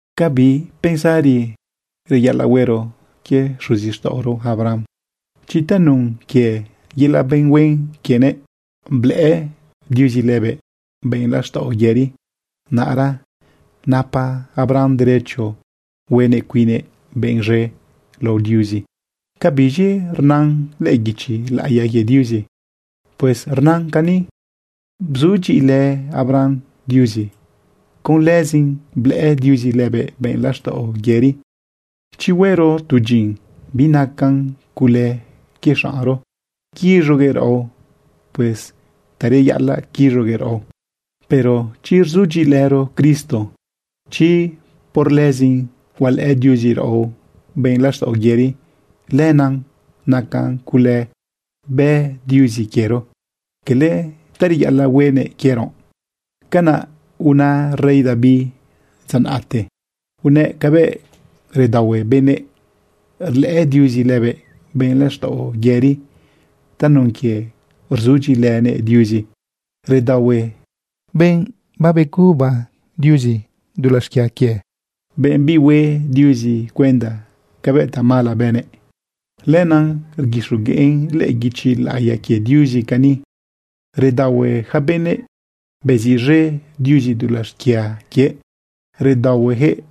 ¿Ca bi pensari reyaꞌalaꞌ huero quie xuzixtaꞌoro Abraham? Chi tanun quie yelaꞌ benꞌ huen quienëꞌ, blëꞌë Diuzi lëbëꞌ benꞌ laxtaꞌo yëri, naꞌra napa Abraham derecho huenëꞌ cuinnëꞌ benꞌ z̃e lao Diuzi. ¿Ca biz̃i rnan lëꞌë guichi laꞌiya quie Diuzi? Pues rnan cani: “Bzudyiꞌilë Abraham Diuzi. Con lëzin blëꞌë Diuzi lëbëꞌ benꞌ laxtaꞌo yëri.” Chi huero tu dyin, binacan cule quie xaꞌnro quiz̃uguëꞌ raꞌo. Pues ta reyaꞌalaꞌ quiz̃uguëꞌ raꞌo. Pero chi rzudyiꞌilëro Cristo, chi por lëzin hualëꞌë Diuzi raꞌo benꞌ laxtaꞌo yëri, lenaꞌ nacan cule bë Diuzi quiero, cala ta reyaꞌalaꞌ huenëꞌ quiero. Canaꞌ una rey David dza naꞌte. Unëꞌ cabëꞌ redaohue benëꞌ rlëꞌë Diuzi lëbëꞌ benꞌ laxtaꞌo yëri tanun quie rzudyiꞌilënëꞌ Diuzi. Redaohue benꞌ babeguba Diuzi dulaꞌ xquia quie, benꞌ bihue Diuzi cuenda cabëꞌ tamala bënëꞌ. Lenaꞌ rguixogueꞌn lëꞌë guichi laꞌiya quie Diuzi cani: Redaohue yaca benëꞌ beziꞌz̃e Diuzi dulaꞌ xquia quie. Redaohuejëꞌ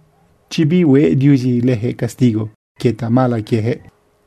chi bihue Diuzi lëjëꞌ castigo quie tamala quiejëꞌ.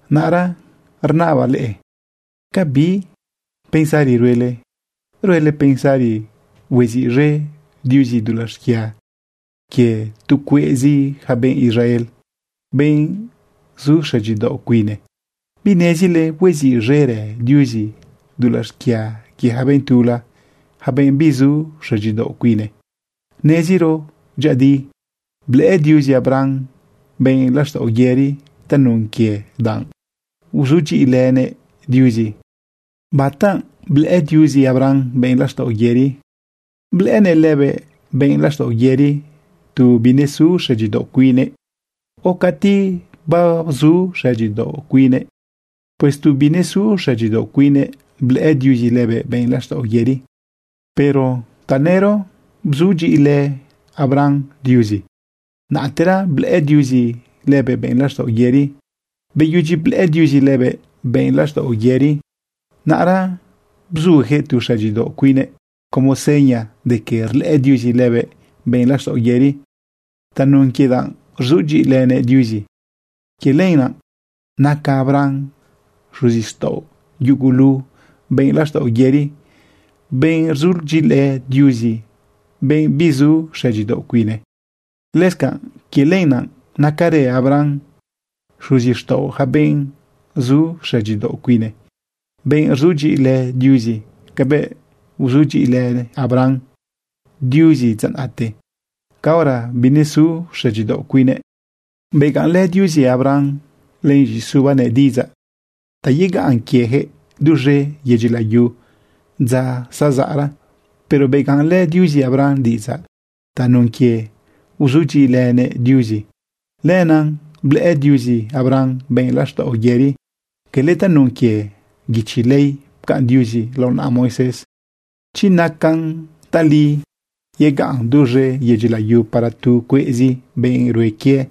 Naꞌra rnabaꞌ leꞌe: ¿Ca bi pensari ruele? ¿Ruele pensari hueziꞌz̃e Diuzi dulaꞌ xquia quie tu cueꞌzi yaca benꞌ Israel, benꞌ zu xëdyidaoꞌ cuine? ¿Binezile hueziꞌz̃erë Diuzi dulaꞌ xquia quie yaca benꞌ tula, yaca benꞌ bizu xëdyidaoꞌ cuine: Neziro dyëꞌëdi blëꞌë Diuzi Abraham benꞌ laxtaꞌo yëri tanun quie danꞌ bzudyiꞌilënëꞌ Diuzi. ¿Bata blëꞌë Diuzi Abraham benꞌ laxtaꞌo yëri? ¿Blëꞌënëꞌ lëbëꞌ benꞌ laxtaꞌo yëri tu binesu xëdyidaoꞌ cuine, o cati babzu xëdyidaoꞌ cuine? Pues tu binesu xëdyidaoꞌ cuine blëꞌë Diuzi lëbëꞌ benꞌ laxtaꞌo yëri. Pero tanëro bzudyiꞌilë Abraham Diuzi, naꞌtera blëꞌë Diuzi lëbëꞌ benꞌ laxtaꞌo yëri. Beyudyi blëꞌë Diuzi lëbëꞌ benꞌ laxtaꞌo yëri, naꞌra bzujëꞌ tu xëdyidaoꞌ cuinnëꞌ como seña de que rlëꞌë Diuzi lëbëꞌ benꞌ laxtaꞌo yëri tanun quie danꞌ rzudyiꞌilënëꞌ Diuzi. Quie lenaꞌ naca Abraham xuzixtaꞌo yugulu benꞌ laxtaꞌo yëri, benꞌ rzudyiꞌilë Diuzi, benꞌ bizu xëdyidaoꞌ cuine. Lëscanꞌ quie lenaꞌ nacarë Abraham xuzixtaꞌo yaca benꞌ zu xëdyidaoꞌ cuine, benꞌ rzudyiꞌilë Diuzi cabëꞌ bzudyiꞌilë Abraham Diuzi dza naꞌte caora binesu xëdyidaoꞌ cuinnëꞌ. Begaꞌnlë Diuzi Abraham len z̃iꞌisubanëꞌ diꞌidzaꞌ ta yegaꞌn quiejëꞌ duz̃e yedyi layu dza zazaꞌra. Pero begaꞌnlë Diuzi Abraham diꞌidzaꞌ tanun quie bzudyiꞌilënëꞌ Diuzi. Lenaꞌ blëꞌë Diuzi Abraham benꞌ laxtaꞌo yëri, cala tanun quie guichi ley pcaꞌn Diuzi lao naꞌa Moisés. Chi nacan tali yegaꞌn duz̃e yedyi layu para tu cueꞌzi benꞌ rue quie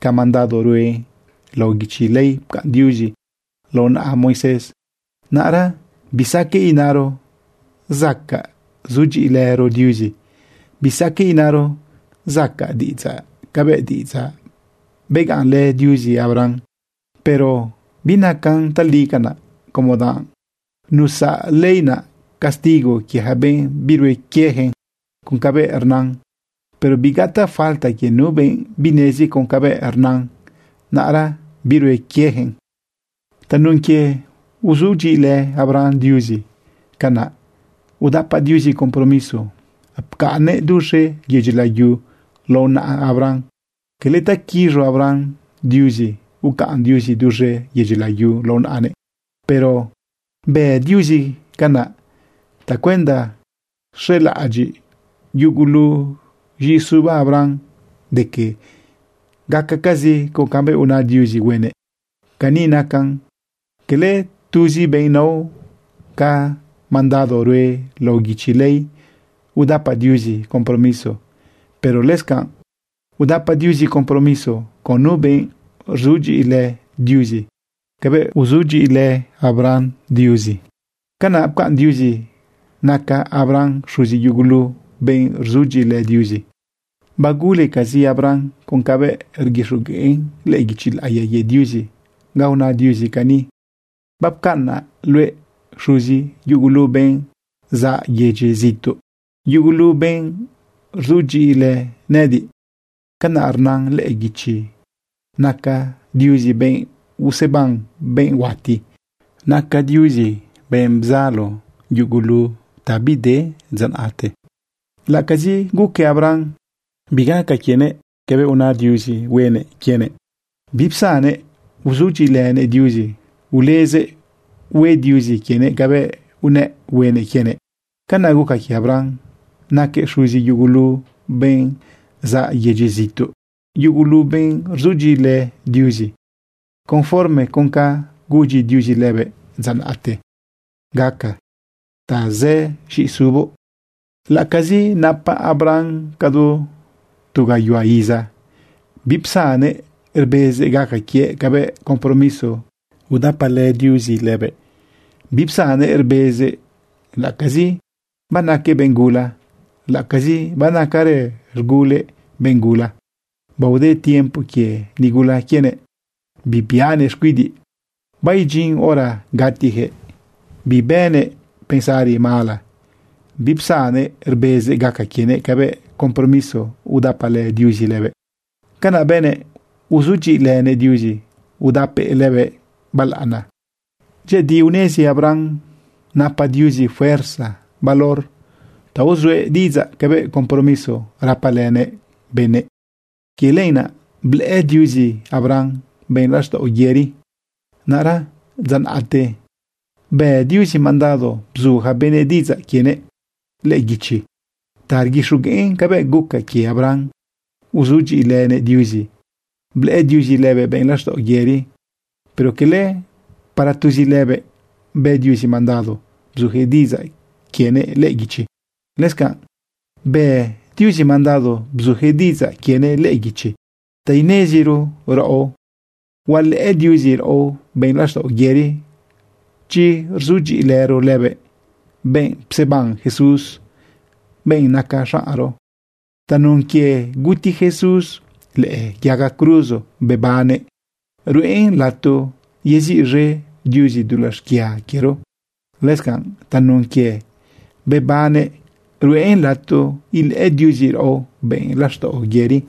ca mandado rue lao guichi ley pcaꞌn Diuzi lao naꞌa Moisés, naꞌra bisaqueꞌ inaro zacaꞌ sudyiꞌilëro Diuzi, bisaqueꞌ inaro zacaꞌ diꞌidzaꞌ cabëꞌ diꞌidzaꞌ beganꞌnlë Diuzi Abraham. Pero binacan tali canaꞌ, como danꞌ nusaꞌ ley naꞌ castigo quie yaca benꞌ birue quieyaquëꞌ con cabëꞌ rnan. Pero bigataꞌ falta quie nu benꞌ binezi con cabëꞌ rnan, naꞌra birue quieyaquëꞌn. Tanun quie bzudyiꞌilë Abraham Diuzi, canaꞌ udapa Diuzi compromiso ucaꞌnnëꞌ duz̃e yedyi layu lao naꞌa Abraham. Cala ta quiz̃u Abraham Diuzi ucaꞌn Diuzi duz̃e yedyi layu lao naꞌanëꞌ. Pero bë Diuzi canaꞌ tacuenda xelaꞌadyiꞌ yugulu z̃iꞌisuba Abraham de que gacacazi con cabëꞌ una Diuzi huenëꞌ. Cani nacan. Cala tuzi benꞌ nao ca mandado rue lao guichi ley udapa Diuzi compromiso, pero lëscanꞌ udapa Diuzi compromiso con nu benꞌ rzudyiꞌilë Diuzi cabëꞌ bzudyiꞌilë Abraham Diuzi. Canaꞌ pcaꞌn Diuzi naca Abraham xuzi yugulu benꞌ rzudyiꞌilë Diuzi. Bagulecazi Abraham con cabëꞌ rguixogueꞌn lëꞌë guichi laꞌiya quie Diuzi ga una Diuzi cani: “Bapcaꞌnaꞌ luëꞌ xuzi yugulu benꞌ zaꞌ yedyi zituꞌ, yugulu benꞌ rzudyiꞌilë nëꞌëdiꞌ.” Canaꞌ rnan lëꞌë guichi. Naca Diuzi benꞌ useban benꞌ huati. Naca Diuzi benꞌ bzalo yugulu ta bide dza naꞌte. Laꞌacazi guque Abraham bigaca quienëꞌ cabëꞌ una Diuzi huenëꞌ quienëꞌ, bipsannëꞌ uzudyiꞌilënëꞌ Diuzi, ulezëꞌ hue Diuzi quienëꞌ cabëꞌ unëꞌ huenëꞌ quienëꞌ. Canaꞌ guca quie Abraham naquëꞌ “xuzi yugulu benꞌ zaꞌ yedyi zituꞌ, yugulu benꞌ rzudyiꞌilë Diuzi”, conforme con ca gudyi Diuzi lëbëꞌ dza naꞌte: “Gaca tazë z̃ꞌisuboꞌ.” Laꞌacazi napa Abraham cadu tu gayuhua iza, bipsannëꞌ rbezëꞌ gaca quiëꞌ cabëꞌ compromiso udapalë Diuzi lëbëꞌ. Bipsannëꞌ rbezëꞌ laꞌacazi banaquëꞌ benꞌ gula, laꞌacazi banacarë z̃gulëꞌ benꞌ gula. Baode tiempo quie nigula quienëꞌ bibiꞌanëꞌ xcuidiꞌ. Baidyin hora gatiyaquëꞌ. Bibënëꞌ pensari mala, bipsannëꞌ rbezëꞌ gaca quienëꞌ cabëꞌ compromiso udapalë Diuzi lëbëꞌ. Canaꞌ bënëꞌ uzudyiꞌilënëꞌ Diuzi udapëꞌ lëbëꞌ balaꞌana. Dyëꞌëdi unezi Abraham napa Diuzi fuerza valor ta uzuëꞌ diꞌidzaꞌ cabëꞌ compromiso rapalënëꞌ benëꞌ. Quie lenaꞌ blëꞌë Diuzi Abraham benꞌ laxtaꞌo yëri. Naꞌra dza naꞌte bë Diuzi mandado bzu yaca benëꞌ diꞌidzaꞌ quienëꞌ lëꞌë guichi ta rguixogueꞌn cabëꞌ guca quie Abraham, bzudyiꞌilënëꞌ Diuzi blëꞌë Diuzi lëbëꞌ benꞌ laxtaꞌo yëri. Pero cala para tuzi lëbëꞌ bë Diuzi mandado bzujëꞌ diꞌidzaꞌ quienëꞌ lëꞌë guichi. Lëscanꞌ bë Diuzi mandado bzujëꞌ diꞌidzaꞌ quienëꞌ lëꞌë guichi ta ineziro raꞌo hualëꞌë Diuzi raꞌo benꞌ laxtaꞌo yëri, chi rzudyiꞌilëro lëbëꞌ, benꞌ pseban Jesús, benꞌ naca zaꞌnro. Tanun quie guti Jesús lëꞌë yaga cruzo bebannëꞌ, ruꞌen lato yeziꞌz̃e Diuzi dulaꞌ xquia quiero. Lëscanꞌ tanun quie bebannëꞌ ruꞌen lato ilëꞌë Diuzi raꞌo benꞌ laxtaꞌo yëri.